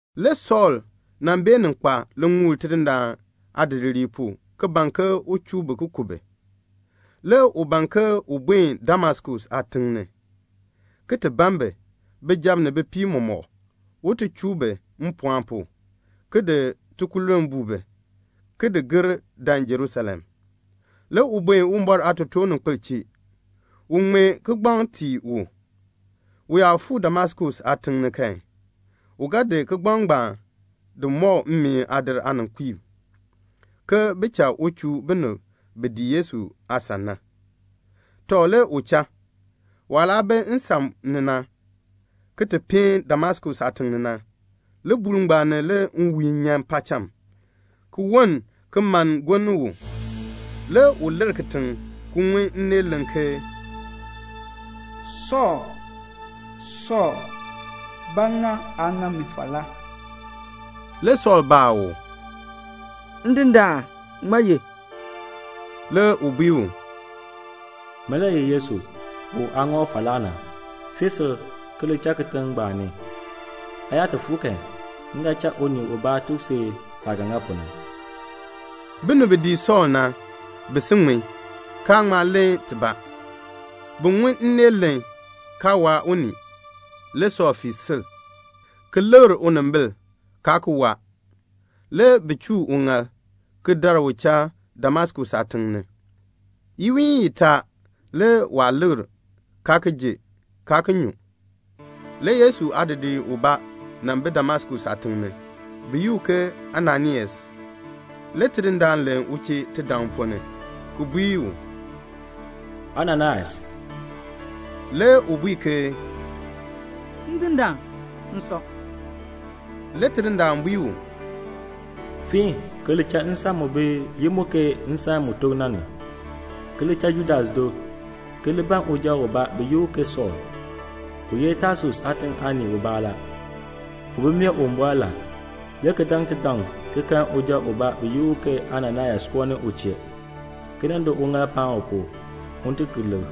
Le Sɔɔl nan beenin kpa liŋuul Tidindaan aadidiliib pu ki ban ke un chuu bi ki ku bi. Le u ban ke un buen Damaskus aatiŋ ni, ki ti ban bi, bijab ni bipiib mɔmɔk, un ti chuu bi mpɔɔn pu, ki di tikululn buu bi, ki di gir dan Jerusalem. Le u buen Uwumbɔr aatotoorninkpil chee, un ŋmee kigbaŋ tii u. U yaa fuu Damaskus aatiŋ ni kan, u ga di kigbaŋ ngbaan di mɔk mmeen aadir aaninkpiib, ke bin cha u chuu binib bi dii Yesu aasan na. Tɔ, le u cha. Waah laa bi nsan ni na, ki ti peen Damaskus aatiŋ ni na, libuul ngbaan ni le nwiihn nyan paacham, ki woln ki mann gonn u. Le u lir kitiŋ, ki ŋun nneel len ke, "Sɔɔl, Sɔɔl, ba ŋa aa ŋa mi falaa?" Le Sɔɔl baa u, "Ndindaan, ŋmaa ye?" Le u bui u, "Min le ye Yesu, u aa ŋa u falaa na. Fii sil, ki li cha kitiŋ ngbaan ni. Aa yaa ti fuu kan, m ga cha unii ubaa tuk si saah ga ŋa pu na." Binib bi dii Sɔɔl na, bi si ŋmin, kaa ŋma len tibaa. Bi ŋun nneel len, kaa waa unii. Le Sɔɔl fii sil, ki likr unimbil, kaa ki waa. Le bi chuu uŋaal, ki dar u cha Damaskus aatiŋ ni. Iwiin itaa le waa likr, kaa ki ji, kaa ki nyu. Le Yesu aadidiir ubaa nan bi Damaskus aatiŋ ni, bi yi u ke Ananias. Le Tidindaan len u chee tidaŋ ponn ni, ki bui u, "Ananias." Le u bui ke, "Ndindaan, m sɔ." Le Tidindaan bui u, "Fiin, ki li cha nsan mu bi yi mu ke Nsan mu tok na ni, ki li cha Judas do, ki li ban uja ubaa bi yi u ke Sɔɔl, u ye Tasus aatiŋ aanii ubaa la. U bi mee Uwumbɔr la, le ki daŋ tidaŋ ki kan uja ubaa bi yi u ke Ananias koo ni u chee, ki nan di uŋaal paan u pu, un ti ki likr."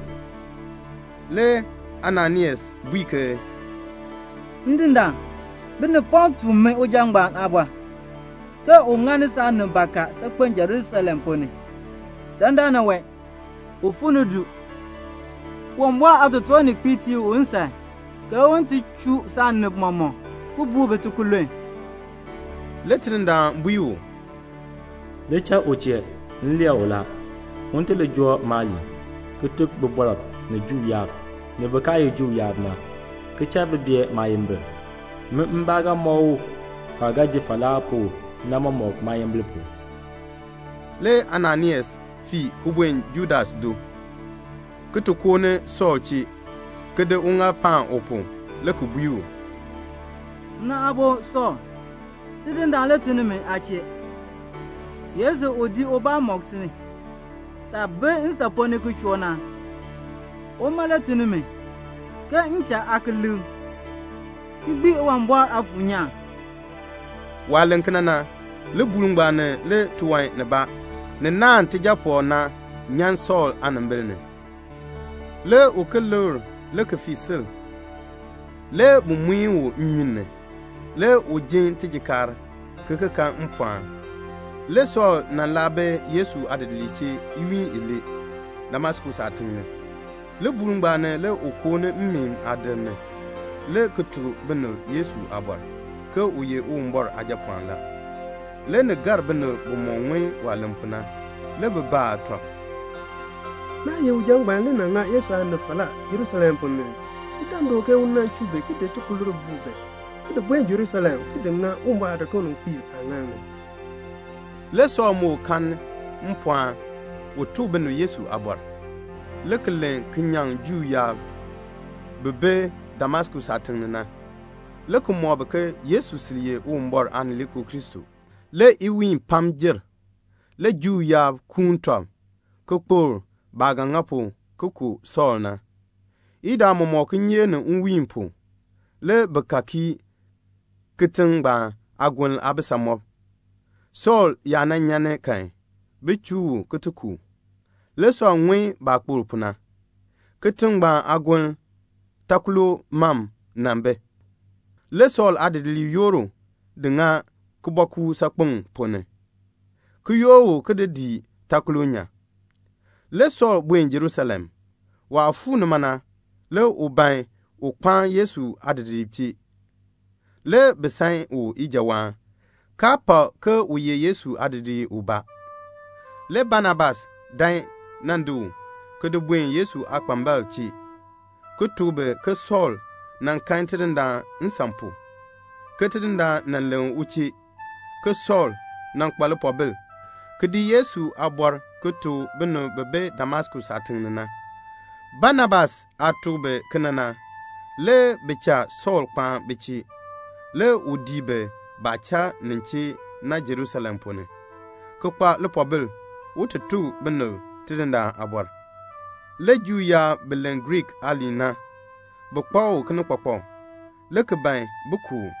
Le Ananias bui ke, "Ndindaan, binib pam tuk mi uja ngbaan aabɔr, ke u ŋani saanib bakaa saakpen Jerusalem ponn ni. Dandana wee, u fuu ni du. Uwumbɔr aatotoorninkpiib tii u nsan ke un ti chuu saanib mɔmɔk, ki buu bi tikululn." Le Tidindaan bui u, "Li cha u chee. M lee u la, un ti li joo maaliin, ki tuk bibɔrb, ni Juu yaab, ni bin kaa ye Juu yaab na, ki cha bi bee maayimbil. Min mbaa ga mɔk u waah ga ji falaa pu na mɔmɔk maayimbil pu." Le Ananias fii ki buen Judas do, ki ti koo ni Sɔɔl chee, ki di uŋaal paan u pu, le ki bui u, "Nna aabo Sɔɔl, Tidindaan le tun ni mi aa chee. Yesu, u di ubaa mɔk si, saah bi nsan ponn ni ki choo na, uma le tun ni mi, ke m cha aa ki likr, ki gbii Uwumbɔr Aafuur nyaan." Waah len kena na, libuul ngbaan ni le tiwan nibaa ni naahn tijaapɔkr na, nyan Sɔɔl aanimbil ni. Le u ki likr, le ki fii sil. Le bi di u ki muin u nnyun ni. Le u jin tijikaar, ki ki kan mpɔɔn. Le Sɔɔl nan laa bi Yesu aadidiliib chee iwiin ilee, Damaskus aatiŋ ni. Libuul ngbaan ni le u koo ni mmeen aadir ni, le ki ti tuk binib Yesu aabɔr, ke u ye Uwumbɔr Aajapɔɔn la. Le ni gar binib bimɔk ŋun waah len pu na. Le bi baa tɔb, "Naa ye uja ngbaan le nan ŋa Yesu aanib falaa Jerusalem ponn ni ii? U dan du, ke u nan chuu bi, ki di tikululn buu bi, ki di buen Jerusalem, ki di ŋa Uwumbɔr aatotoorninkpiib aaŋaal ni." Le Sɔɔl moo kanni mpɔɔn un ti tuk binib Yesu aabɔr, le ki len ki nyaŋ Juu yaab bi bi Damaskus aatiŋ ni na, le ki mɔk bi ke Yesu sil ye Uwumbɔr Aanileekoo Kristo. Le iwiin pam jer. Le Juu yaab kuun tɔb, ki kpokl baah ga ŋa pu ki ku Sɔɔl na. Idaa mɔmɔk, kinyeek ni nwiin pu, le bi ka kii kitiŋ ngbaan aagoln aabisamɔb, Sɔɔl yaa nan nyan ni kan, bin chuu u ki ti ku u. Le Sɔɔl ŋun baah kpokl pu na. Kitiŋ ngbaan aagoln, takolo mam nan bi. Le Sɔɔl aadidiliib yoor u di ŋa kibɔɔkuuk saakpeŋ ponn ni, ki yoor u ki di u dii takolo nyan. Le Sɔɔl buen Jerusalem. Waah fuu nima na, le u ban un kpaan Yesu aadidiliib chee. Le bi san u ijawaan, kaa pak ke u ye Yesu aadidiir ubaa. Le Banabas dan nan di u ki di buen Yesu aakpambalb chee, ki tuk bi ke Sɔɔl nan kan Tidindaan nsan pu, ke Tidindaan nan len u chee, ke Sɔɔl nan kpa lipoobil ki di Yesu aabɔr ki tuk binib bi bi Damaskus aatiŋ ni na. Banabas aah tuk bi kena na, le bi cha Sɔɔl kpaan bi chee. Le u dii bi baah cha nin chee na Jerusalem ponn ni, ki kpa lipoobil un ti tuk binib Tidindaan aabɔr. Le Juu yaab bi len Griik aaliin na, bi kpak u kinikpakpak, le ki ban bin ku u.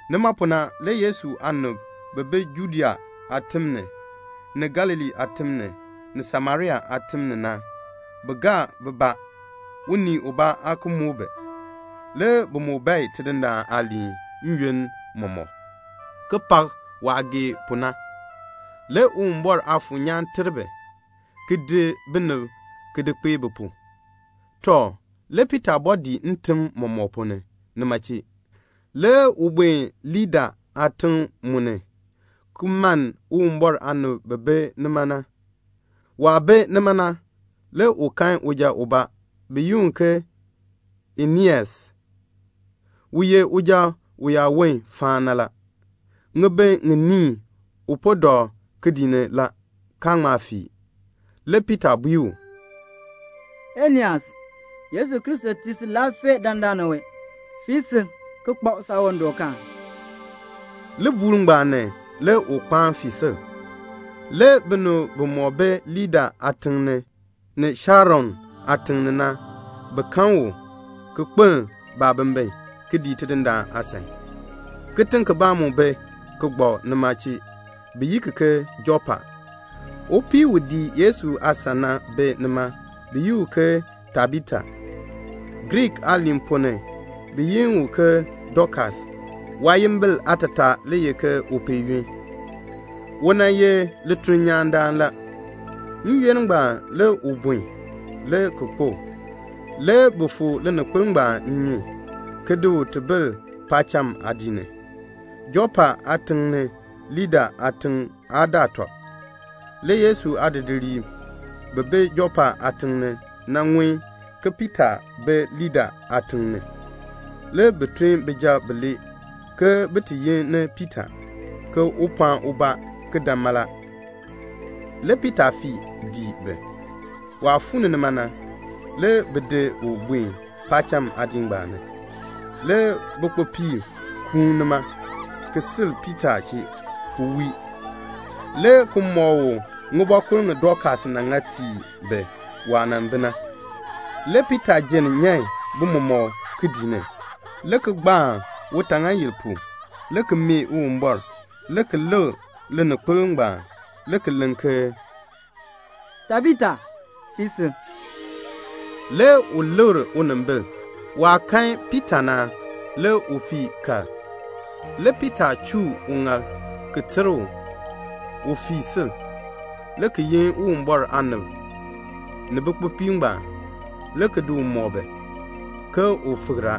Nima pu na le Yesu aanib bi bi Judea aatim ni, ni Galilee aatim ni, ni Samaria aatim ni na, bi gaa bibaa. Unii ubaa aa ki muk bi. Le bi moo bae Tidindaan aaliin n-yoonn mɔmɔk, ki pak waah gee pu na. Le Uwumbɔr Aafuur nyaan ter bi, ki di binib ki di kpee bi pu. Tɔ, le Piita bɔɔ dii ntim mɔmɔk ponn ni nima chee. Le u buen Lida aatiŋ mu ni, ki mann Uwumbɔr aanib bi bi nima na. Waah bi nima na, le u kan uja ubaa, bi yi u ke Eneas, u ye uja uyaawon faan na la. Ŋibin ŋiniin u po dɔ kidiik ni la, kaa ŋma fii. Le Piita bui u, "Eneas, Yesu Kristo tii si laafee dandana wee. Fii sil, ki kpab saawandɔkaan." Libuul ngbaan ni le u kpaan fii sil. Le binib bimɔk bi Lida aatiŋ ni, ni Sharon aatiŋ ni na, bi kan u, ki kpeln baabimbin, ki dii Tidindaan aasan. Kitiŋ kibaa mu bi, ki gbak nima chee, bi yi ki ke Jɔpa. Upii u dii Yesu aasan na bi nima, bi yi u ke Tabita. (Griik aaliin ponn ni, bi yi u ke Dokas. Waayimbil aatataa le ye ke upeeyuk.) U nan ye litulnyaandaan la. N-yoonn ngbaan le u bun, le ki kpo. Le bi fu lininkpol ngbaan nnyun, ki di u ti bil paacham aadiik ni. Jɔpa aatiŋ ni Lida aatiŋ aa daa tɔb. Le Yesu aadidiliib bi bi Jɔpa aatiŋ ni na ŋun ke Piita bi Lida aatiŋ ni. Le bi tun bijab bilee, ke bin ti yi ni Piita, ke un pɔɔn ubaa ki dan mala. Le Piita fii dii bi. Waah fuu ni nima na, le bi di u buen paacham aadiik ngbaan ni. Le bikpopiib kuun nima, ki sil Piita chee, ki wii, le ki mɔk u ŋibɔkur ŋi Dokas nan ŋa tii bi na, waah nan bi na. Le Piita jenn nyan bi mɔmɔk kidiik ni, le ki gbaan utaaŋaayil pu, le ki mee Uwumbɔr, le ki lik lininkpol ngbaan le ki len ke "Tabita, fii sil." Le u likr unimbil. Waah kan Piita na, le u fii kal. Le Piita chuu uŋaal, ki ter u, un fii sil, le ki yin Uwumbɔr aanib ni bikpopiib ngbaan, le ki di u mɔk bi, ke u fikr a.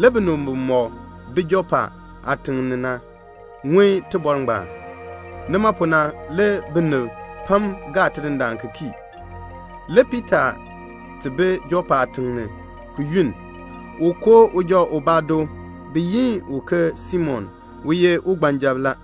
Le binib bimɔk bi Jɔpa aatiŋ ni na ŋun tibɔr ngbaan. Nima pu na le binib pam gaa Tidindaan ki kii. Le Piita ti bi Jɔpa aatiŋ ni, ki yunn. U koo uja ubaa do, bi yi u ke Simon, u ye ugbanjab la.